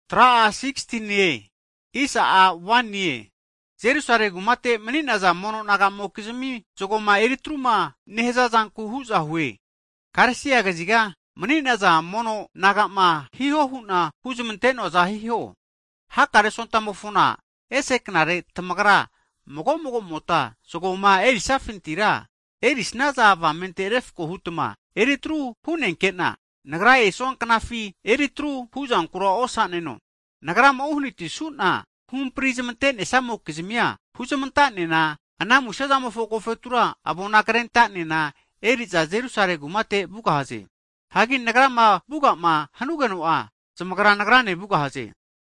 Hagi Jerusalemi kumate mani'naza mono naga'mokizmi zagoma eri atruma nehaza zanku hu'za hue, Galesia kaziga mani'naza mono naga'ma hiho hu'na huzmante'noaza hiho. Hakare Sontamofona ese knare, tamagra mago mago'mota zago'ma erisafintira, erisnaza avamente refko hutma eri atru hu'nenke'na, nagrama esua knafina eri tru huzankura amuhoa osaneno. Nagrama uhanatisu'na huhampri' zmante'nesamokizmia, huzmanta'nena, ana musezamofo agofetura avonkrenta'nena eri'za Jerusalemi kumate vugahaze. Hagi nagrama vuga'ma hanugeno'a, zamagra nagrane vugahaze.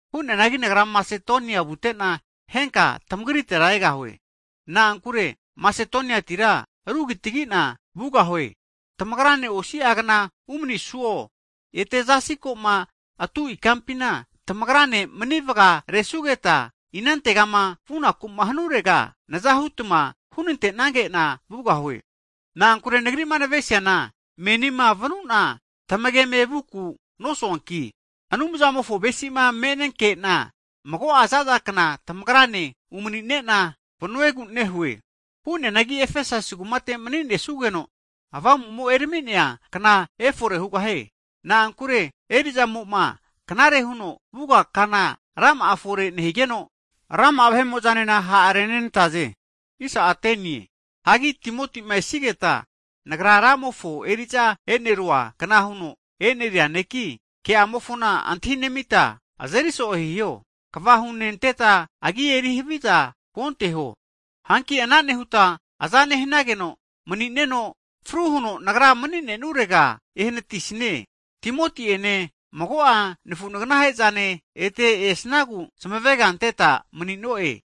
Hu'neanagi nagra Masetonia vute'na, henka tamagritega egahue. Na'ankure Masetoniati ru kitagi'na vugahue. Tamagrane osi'agna umanisuo, ete zasi ko'ma atu ikampina tamagrane mani vagaresugeta, inantegama vunaku'ma hanurega naza hu'tma hunante'nage'na vugahue. Na'ankure nagri'ma navenesiana menima vanu'na tamageme vuku nosuanki, Anumzamofo avesima me'nenke'na mago'a zaza kna tamagrane umani'ne'na vanuegu nehue. Hu'neanagi Efesasi kumate mani'nesugeno, Pentikos kna efore hugahie. Na'ankure eri'zamo'ma knare huno vuga kana rama'a efore nehigeno, rama'a vahe'mo'zanena ha' renenantaze. Hanki Timoti'ma esigeta, nagra Ramofo eri'za e'neruankna huno e'neria neki, ke'amofona antahinemita azeri so'e hiho. Kva hunenteta agia eri haviza osiho. Hanki ana nehuta aza nehnageno mani'neno, fru huno nagra mani'ne'nurega ehanatisnie. Timoti'ene mago'a nafu naganahe'zane ete esnagu zamavega ante'na mani'noe.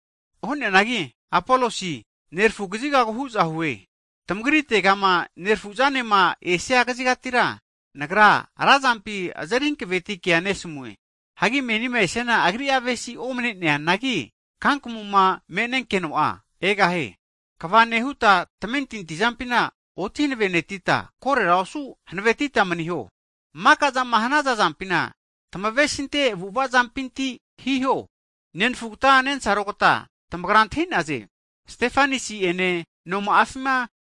Hu'neanagi Apolosi, nerafu kazigagu hu'za hue. Tamagritegama nerafuzanema esia kazigatira, nagra razampi azeri hanaveti kea nesamue. Hagi menima esiana agri'a avesi omne'neanagi, kankamuma me'nenkeno'a agra egahie. Hagi kava huta nemanita, tamentinti zampi oti hanavenetita, korera osu hanavetita maniho. Maka'zama hanaza'zampina tamavesinte avu'ava zampinti hiho. Nenfugta nensarogta tamagra antahi'naze, (Stefanisi ene noma'afi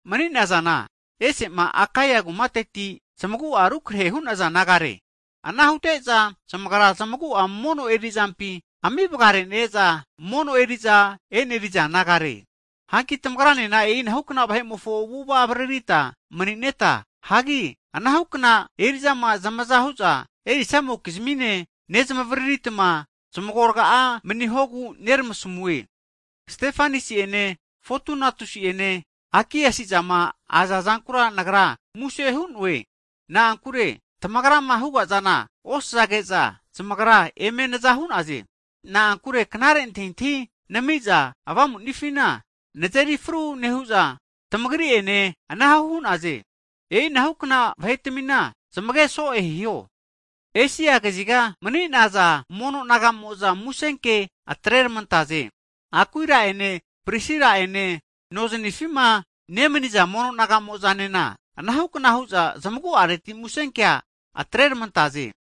mani'nazana, ese'ma Akaia kumateti zmagu'a rukrehe hu'naza nagare. Ana hute'za zamagra zamagu'a mono eri'zampi ami vaganere'za mono eri'za e'neri'za nagare). Hanki tamagranena e'inahukna vahe'mofo avu'ava avaririta mani'neta, hagi anahukna eri'zama zamaza hu'za erisazamokizmine, nezmavariritma zmagorga'a manihogu neramasamue. Stefanasi ene Fotunatusi'ene Akiakusizama aza zankura nagra muse hu'no'e. Na'ankure tamagrama huga'zana osazage'za zamagra eme naza hu'naze. Na'ankure knare antahintahi nami'za avamu'nifina nazeri fru nehu'za, tamagri'ene ana hu'naze. E'inahukna vahetmina zamege so'e hiho. Esia kaziga mani'naza mono naga'mo'za musenke atreramantaze. Akuira'ene Prisila'ene noznifima nemaniza mono naga'mo'zanena anahukna hu'za zamagu'areti musenkea atrenermantaze.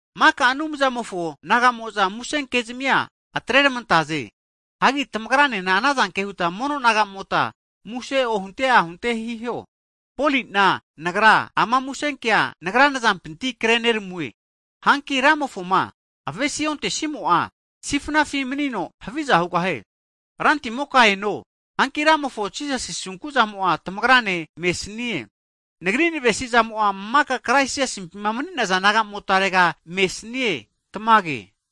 Maka Anumzamofo naga'mo'za musenkezmia atreramantaze. Hanki tamagranena ana zanke huta mono naga'mota muse ohunte ahunte hiho. Poli'na nagra, ama musenkea, nagra nazampinti kre neramue. Hanki Ramofoma avesi ontesnimo'a, sifnafi manino haviza hugahie. Rantimoka eno! Hanki Ramofo Jisasi asunku zamo'a tamagrane mesanie. Nagri nevesi'zamo'a maka Krais Jisasimpima mani'naza naga'motarega mesanie. Tamage.